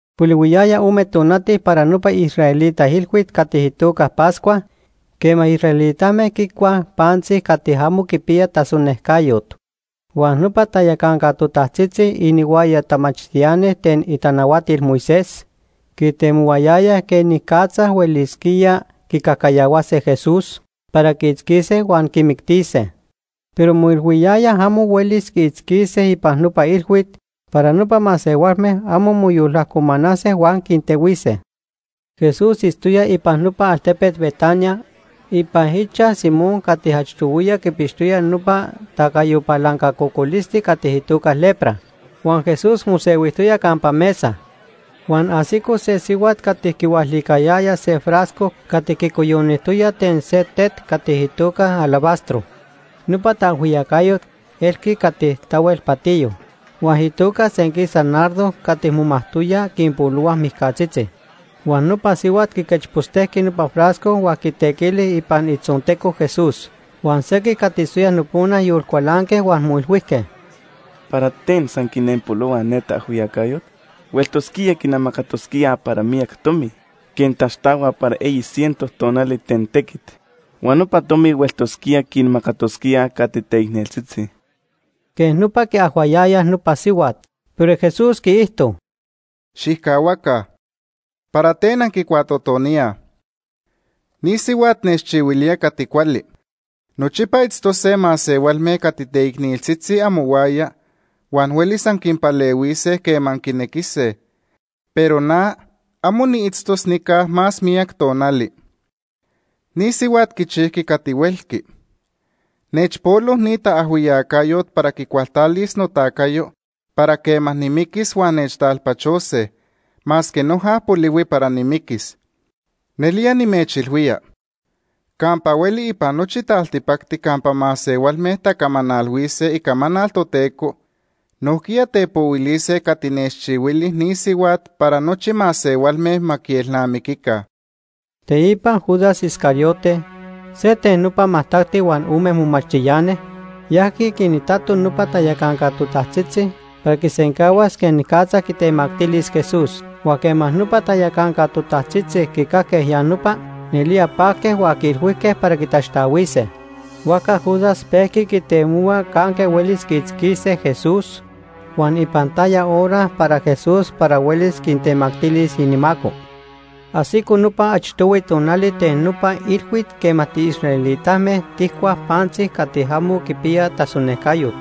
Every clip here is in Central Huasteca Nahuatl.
Polihuiyaya ome tonati para nopa israelita ilhuit cati itoca Pascua quema israelitame quicuaj pantzi cati amo quipiya tasonejcayot. Huan nopa tayacanca totajtzitzi inihuaya tamachtiani ten itanahuatil Moisés quitemohuayayaj quenicatza huelisquíaj quicajcayahuase Jesús para quiitzquise huan quimictise. Pero moilhuiyayaj amo huelis quiitzquise ipan nopa ilhuit para nopa masehualme amo moyolajcomanase huan quintehuise. Jesús itztoya ipan nopa altepet Betania ipan ichaj Simón cati achtohuiya quipixtoya nopa tacayo palanca cocolisti cati itoca lepra. Huan Jesús mosehuijtoya campa mesa, huan ajsico se sihuat cati quihualicayaya se frasco cati quicoyonijtoya ten se tet cati itoca alabastro. Nopa taajhuiyacayot elqui cati tahuel patiyo huan itoca senquisa nardo cati momajtoyaj quinpolohuaj mijcatzitzi. Huan nopa sihuat quiquechpostejqui nopa frasco huan quitequili ipan itzonteco Jesús. Huan sequij cati itztoyaj nopona yolcualanque huan moilhuijque: ―¿Para ten san quinenpolohua ne taajhuiyacayot? Hueltosquía quinamacatosquía para miyac tomi quej taxtahuaj para eyi ciento tonali ten tequit huan nopa tomi hueltosquía quinmacatosquíaj cati teicneltzitzi. Quej nopa quiajhuayayaj nopa sihuat. Pero Jesús quiijto: ―Xijcahuaca, ¿para ten anquicuatotoníaj? Ni sihuat nechchihuilía cati cuali. Nochipa itztose masehualme cati teicneltzitzi amohuaya, huan huelis anquinpalehuise quema anquinequise, pero na, amo niitztos nica más miyac tonali. Ni sihuat quichijqui cati huelqui. Nechpolo ni taajhuiyacayot para quicualtalis notacayo para quema nimiquis huan nechtalpachose, masque noja polihui para nimiquis. Nelía nimechilhuía, campa hueli ipan nochi taltipacti campa masehualme tacamanalhuise icamanal Toteco, nojquiya tepohuilise cati nechchihuili ni sihuat para nochi masehualme ma quielnamiquica. Teipa Judas Iscariote, se ten nopa majtacti huan ome momachtiani, yajqui quinitato nopa tayacanca totajtzitzi para quisencahuas quenicatza quitemactilis Jesús. Huan quema nopa tayacanca totajtzitzi quicajque ya nopa, nelía pajque huan quiilhuijque para quitaxtahuise. Huajca Judas pejqui quitemohua canque huelis quiitzquise Jesús huan ipan taya hora para Jesús para huelis quitemactilis inimaco. Ajsico nopa achtohui tonali ten nopa ilhuit quema tiisraelitame tijcuaj pantzi cati amo quipiya tasonejcayot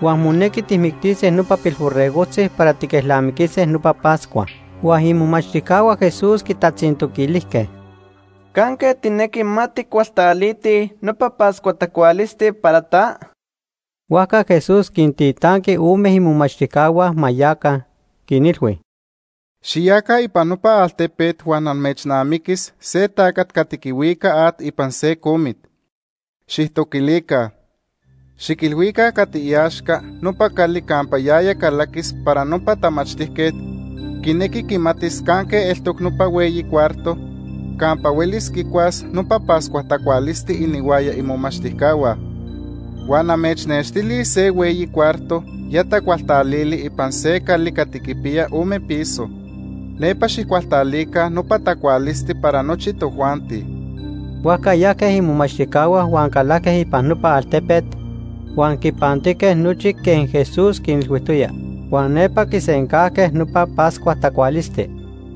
huan monequi tijmictise nopa pilborregojtzi para tiquelnamiquise nopa Pascua. Huan imomachtijcahua Jesús quitatzintoquilijque: ―¿Canque tijnequi ma tijcualtalitij nopa Pascua tacualisti para ta? Huajca Jesús quintitanqui ome imomachtijcahua ma yaca, quinilhui: ―Xiyaca ipan nopa altepet huan amechnamiquis se tacat cati quihuica at ipan se comit. Xijtoquilica. Xiquilhuica cati iaxca nopa cali campa yaya calaquis para nopa tamachtijquet quinequi quimatis canque eltoc nopa hueyi cuarto campa huelis quicuas nopa Pascua tacualisti inihuaya imomachtijcahua. Huan amechnextilis se hueyi cuarto ya tacualtalili ipan se cali cati quipiya ome piso. Nepa xijcualtalica nopa tacualisti para nochi tojuanti. Huajca yajque imomachtijcahua huan calajque ipan nopa altepet, huan quipantijque nochi quej Jesús quinilhuijtoya. Huan nepa quisencajque nopa Pascua tacualisti.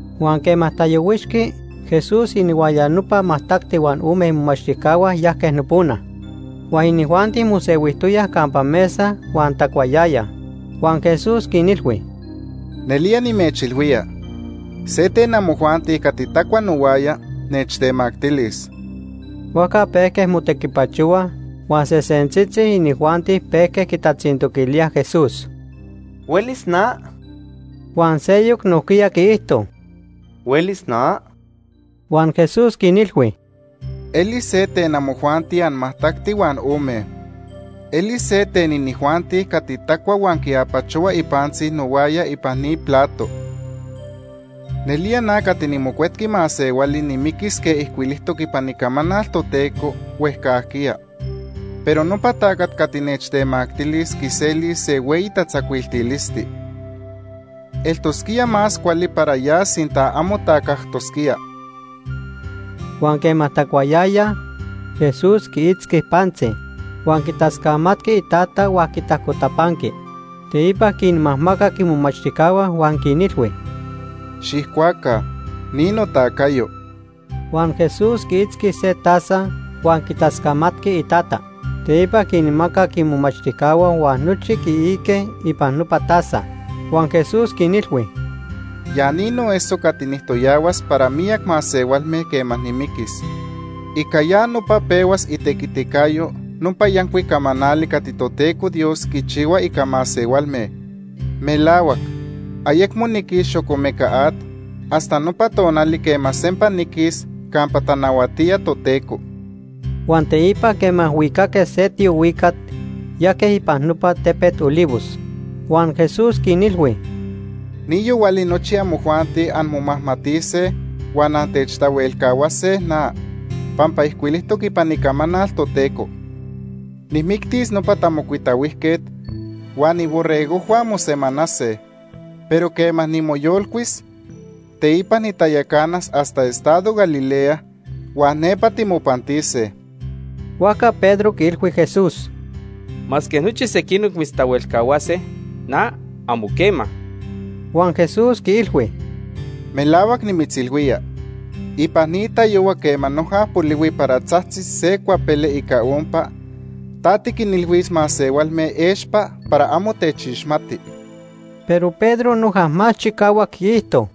Huan quema tayohuixqui, Jesús inihuaya nopa majtacti huan ome imomachtijcahua yajque nopona. Huan inijuanti mosehuijtoyaj campa mesa huan tacuayayaj, huan Jesús quinilhui: ―Nelía nimechilhuía, se ten amojuanti cati tacua nohuaya, nechtemactilis. Huajca pejque motequipachohuaj huan sesentzitzi inijuanti pejque quitatzintoquilíaj Jesús: ―¿Huelis na? Huan seyoc nojquiya quiijto: ―¿Huelis na? Huan Jesús quinilhui: ―Elis se ten amojuanti anmajtacti huan ome. Elis se ten inijuanti cati tacua huan quiapachohua ipantzi nohuaya ipan ni plato. Nelía na cati niMocuetqui Masehuali nimiquis quej ijcuilijtoc ipan Icamanal Toteco huejcajquiya, pero nopa tacat cati nechtemactilis quiselis se hueyi tatzacuiltilisti. Eltosquía más cuali para ya sinta amo tacajtosquía. Huan quema tacuayayaj, Jesús quiitzqui pantzi, huan quitascamatqui iTata huan quitajcotapanqui. Teipa quinmajmacac imomachtijcahua huan quinilhui: ―Xijcuaca, ni notacayo. Huan Jesús quiitzqui se taza huan quitascamatqui iTata. Teipa quinmacac imomachtijcahua huan nochi quiique ipan nopa taza. Huan Jesús quinilhui: ―Ya ni noeso cati nijtoyahuas para miyac masehualme quema nimiquis. Ica ya nopa pehuas itequiticayo nopa yancuic camanali cati Toteco Dios quichihua ica masehualme. Melahuac, ayecmo niquis xocomeca at hasta nopa tonali quema sempa niquis campa tanahuatía Toteco. Huan teipa quema huicaque se tiohuicat, yajque ipan nopa tepet Olivos. Huan Jesús quinilhui: ―Ni yohuali nochi amojuanti anmomajmatise huan antechtahuelcahuase na, pampa ijcuilijtoc ipan Icamanal Toteco: ‘Nijmictis nopa tamocuitahuijquet, huan iborregojhua mosemanase.’ Pero quema nimoyolcuis, teipa nitayacanas hasta estado Galilea, huan nepa timopantise. Huajca Pedro quiilhui Jesús: ―Masque nochi sequinoc mitztahuelcahuase, na, amo quema. Huan Jesús quiilhui: ―Melahuac nimitzilhuía, ipan ni tayohua quema noja polihui para tzajtzis se cuapele ica ompa, ta tiquinilhuis masehualme expa para amo techixmati. Pero Pedro noja más chicahuac quiijto: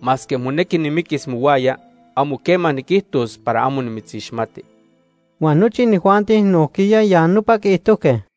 ―Masque monequi nimiquis mohuaya, amo quema niquijtos para amo nimitzixmati. Huan nochi inijuanti nojquiya ya nopa quiijtojque.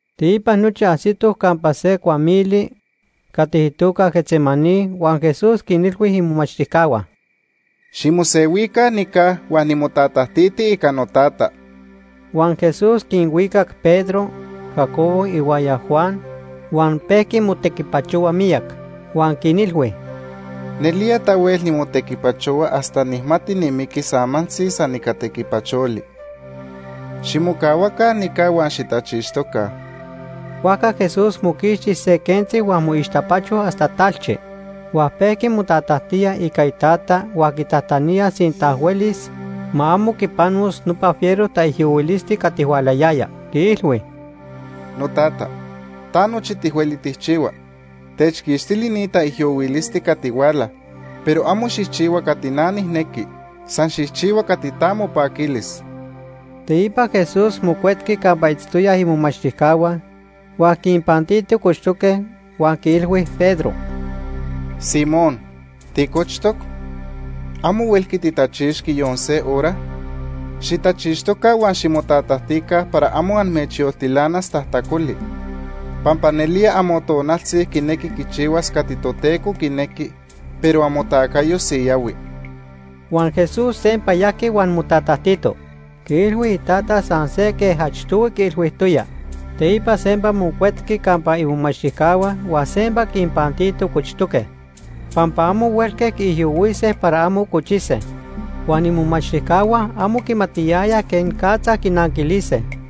Teipa nochi ajsitoj campa se cuamili cati itoca Getsemaní huan Jesús quinilhui imomachtijcahua: ―Ximosehuica nica huan nimotatajtiti ica noTata. Huan Jesús quinhuicac Pedro, Jacobo, ihuaya Juan huan pejqui motequipachohua miyac. Huan quinilhui: ―Nelía tahuel nimotequipachohua hasta nijmati nimiquis amantzi san ica tequipacholi. Ximocahuaca nica huan xitachixtoca. Huajca Jesús moquixti se quentzi huan moixtapacho hasta talchi. Huan pejqui motatajtía ica Itata huan quitajtanía sinta huelis, ma amo quipanos nopa fiero taijyohuilisti cati hualayaya. Quiilhui: “Notata, ta nochi tihueli tijchihua. Techquixtili ni taijyohuilisti cati huala, pero amo xijchihua cati na nijnequi, san xijchihua cati ta mopaquilis.” Teipa Jesús mocuetqui campa itztoyaj imomachtijcahua huan quinpantito cochtoque huan quiilhui Pedro: ―Simón, ¿ticochtoc? ¿Amo huelqui titachixqui yon se hora? Xitachixtoca huan ximotatajtica para amo amechyoltilanas tajtacoli, pampa nelía amotonaltzi quinequi quichihuas cati Toteco quinequi, pero amotacayo siyahui. Huan Jesús sempa yajqui huan motatajtito. Quiilhui Itata san se quej achtohui quiilhuijtoya. Teipa sempa mocuetqui campa imomachtijcahua huan sempa quinpantito cochtoque, pampa amo huelque quiijyohuise para amo cochise. Huan imomachtijcahua amo quimatiyayaj quenicatza quinanquilise.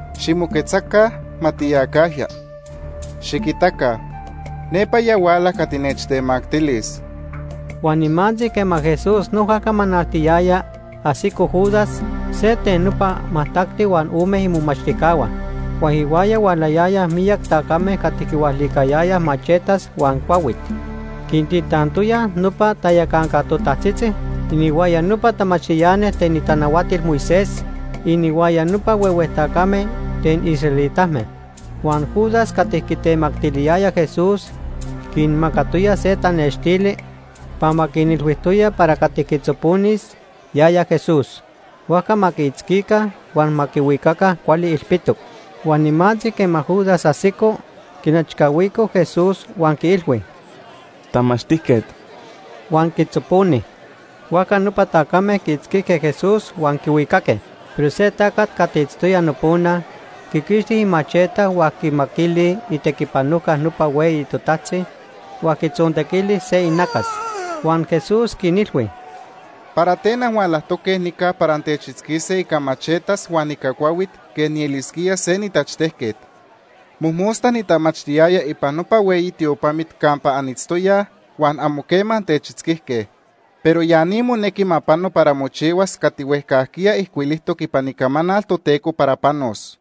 Ximoquetzaca, ma tiyacajya. Xiquitaca, nepa ya huala cati nechtemactilis. Huan nimantzi quema Jesús noja camanaltiyaya, ajsico Judas, se ten nopa majtacti huan ome imomachtijcahua. Huan ihuaya hualayayaj miyac tacame cati quihualicayayaj machetas huan cuahuit. Quintitantoyaj nopa tayacanca totajtzitzi, inihuaya nopa tamachtiani ten itanahuatil Moisés, inihuaya nopa huehue tacame ten israelitame. Huan Judas cati quitemactiliyaya Jesús quinmacatoya se tanextili pampa quinilhuijtoya para cati quitzoponis, yaya Jesús. Huajca ma quiitzquica, huan ma quihuicaca cuali ilpitoc. Huan nimantzi quema Judas ajsico, quinechcahuico Jesús huan quiilhui: ―¡Tamachtijquet! Huan quitzoponi. Huajca nopa tacame quiitzquijque Jesús huan quihuicaque. Pero se tacat cati itztoya nopona quiquixti imacheta huan quimaquili itequipanojca nopa hueyi totajtzi, huan quitzontequili se inacas. Huan Jesús quinilhui: ―¿Para ten anhualajtoque nica para antechitzquise ica machetas huan ica cuahuit quej nielisquía se nitachtejquet? Mojmosta nitamachtiyaya ipan nopa hueyi tiopamit campa anitztoyaj huan amo quema antechitzquijque. Pero ya ni monequi ma pano para mochihuas cati huejcajquiya ijcuilijtoc ipan Icamanal Toteco para panos.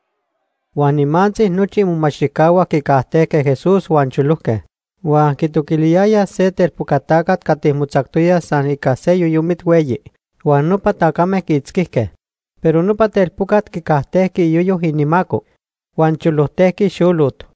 Huan nimantzi nochi imomachtijcahua quicajtejque Jesús huan cholojque. Huan quitoquiliyaya se telpoca tacat cati motzactoya san ica se yoyomit hueyi. Huan nopa tacame quiitzquijque, pero nopa telpocat quicajtejqui iyoyo inimaco, huan cholojtejqui xolot.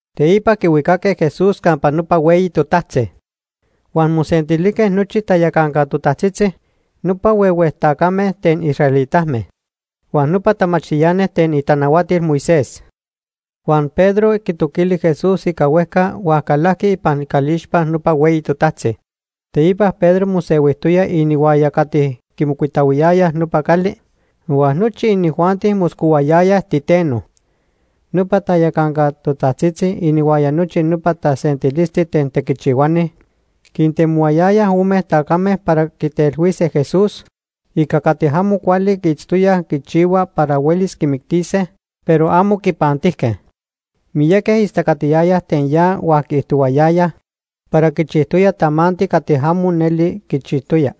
Teipa quihuicaque Jesús campa nopa hueyi totajtzi. Huan mosentilijque nochi tayacanca totajtzitzi, nopa huehue tacame ten israelitame, huan nopa tamachtiani ten itanahuatil Moisés. Huan Pedro quitoquili Jesús ica huejca huan calajqui ipan icalixpa nopa hueyi totajtzi. Teipa Pedro mosehuijtoya inihuaya cati quimocuitahuiyayaj nopa cali, huan nochi inijuanti moscohuayaya titeno. Nopa tayacanca totajtzitzi inihuaya nochi nopa tasentilisti ten tequichihuani quintemohuayayaj ome tacame para quitelhuise Jesús ica cati amo cuali quiitztoyaj quichihua para huelis quimictise, pero amo quinpantijque. Miyaqui istacatiyayaj ten ya huan quiijtohuayayaj para quichijtoya tamanti cati amo neli quichijtoya,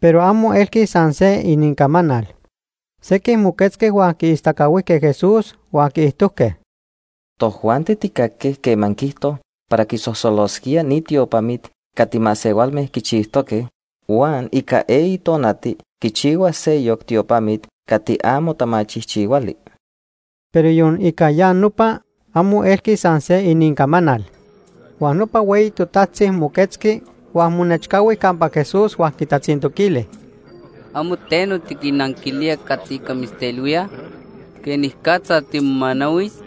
pero amo elqui san se inincamanal. Sequij moquetzque huan quiistacahuijque Jesús, huan quiijtojque: ―Tojuanti tijcajque quema quiijto para quisosolosquía ni tiopamit cati masehualme quichijtoque, huan ica eyi tonati quichihuas seyoc tiopamit cati amo tamachijchihuali. Pero yon ica ya nopa, amo elqui san se inincamanal. Huan nopa hueyi totajtzi moquetzqui huan monechcahui campa Jesús huan quitatzintoquili: ―¿Amo teno tiquinnanquilía cati ica mitztelhuíaj? ¿Quenicatza timomanahuis?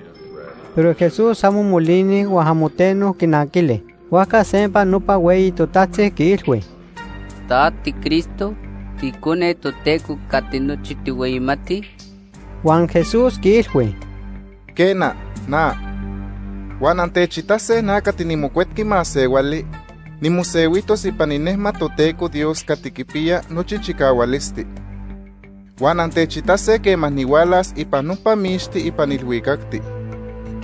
Pero Jesús amo molini huan amo teno quinanquili. Huajca sempa nopa hueyi totajtzi quiilhui: ―¿Ta tiCristo, tiIcone Toteco cati nochi tijhueyimatij? Huan Jesús quiilhui: ―Quena, na. Huan antechitase na cati niMocuetqui Masehuali nimosehuijtos ipan inejmat Toteco Dios cati quipiya nochi chicahualisti. Huan antechitase quema nihualas ipan nopa mixti ipan ilhuicacti.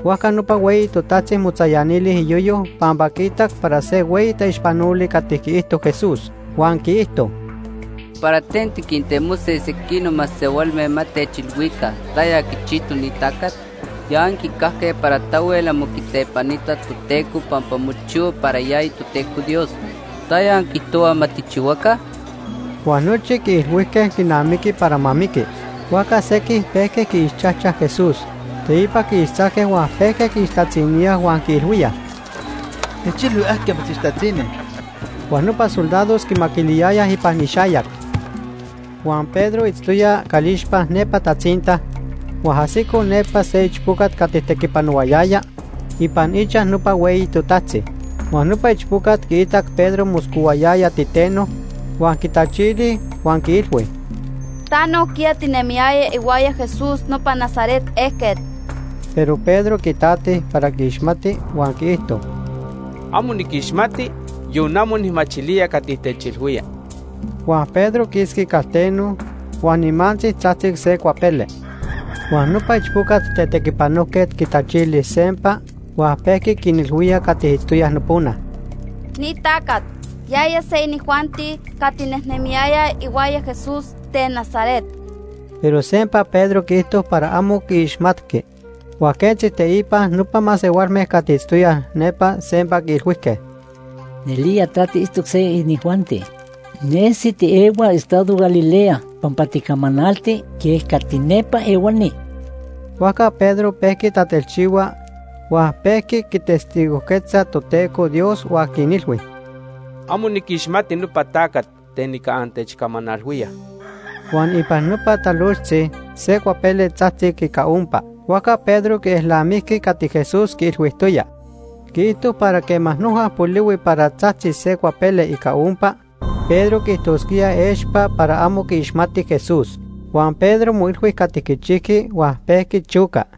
Huajca nopa hueyi totajtzi motzayanili iyoyo pampa quiitac para se hueyi taixpanoli cati quiijto Jesús. Huan quiijto: ―¿Para ten tiquintemose sequinoc masehualme ma techilhuica taya quichijtoc ni tacat? Ya anquicajque para tahuel amo quitepanita Toteco pampa mochihua para yaya Toteco Dios. ¿Taya anquiijtohuaj ma tijchihuaca? Huan nochi quiilhuijque quinamiqui para ma miqui. Huajca sequij pejque quiixchajchaj Jesús. Teipa quiixtzajque huan pejque quiixtatziníaj huan quiilhuíaj: ―¡Techilhui ajquiya mitzixtatzini! Huan nopa soldados quimaquiliyayaj ipan ixayac. Huan Pedro itztoya calixpa nepa tatzinta, huan ajsico nepa se ichpocat cati tequipanohuayaya ipan ichaj nopa hueyi totajtzi. Huan nopa ichpocat quiitac Pedro moscohuayaya titeno, huan quitachili huan quiilhui: ―Ta nojquiya tinemiyaya ihuaya Jesús nopa Nazaret ejquet. Pero Pedro quitati para quiixmati, huan quiijto: ―Amo niquixmati, yon amo nijmachilía cati techilhuía. Huan Pedro quisqui calteno, huan nimantzi tzajtzic se cuapele. Huan nopa ichpoca tetequipanojquet quitachili sempa huan pejqui quinilhuía cati itztoyaj nopona: ―Ni tacat, yaya se inijuanti cati nejnemiyayaj ihuaya Jesús ten Nazaret. Pero sempa Pedro quiijto para amo quiixmatqui. Huan quentzi teipa, nopa masehualme cati itztoyaj nepa sempa quiilhuijque: ―Nelía ta tiitztoc se inijuanti. Nesi tiehua estado Galilea pampa ticamanalti quej cati nepa ehuani. Huajca Pedro pejqui tatelchihua huan pejqui quitestigojquetza Toteco Dios huan quinilhui: ―Amo niquixmati nopa tacat ten ica antechcamanalhuíaj. Huan ipan nopa talojtzi se cuapele tzajtzic ica ompa. Huajca Pedro quielnamijqui cati Jesús quiilhuijtoya. Quiijto para quema noja polihui para tzajtzis se cuapele ica ompa, Pedro quiijtosquía expa para amo quiixmati Jesús. Huan Pedro moilhui cati quichijqui huan pejqui choca.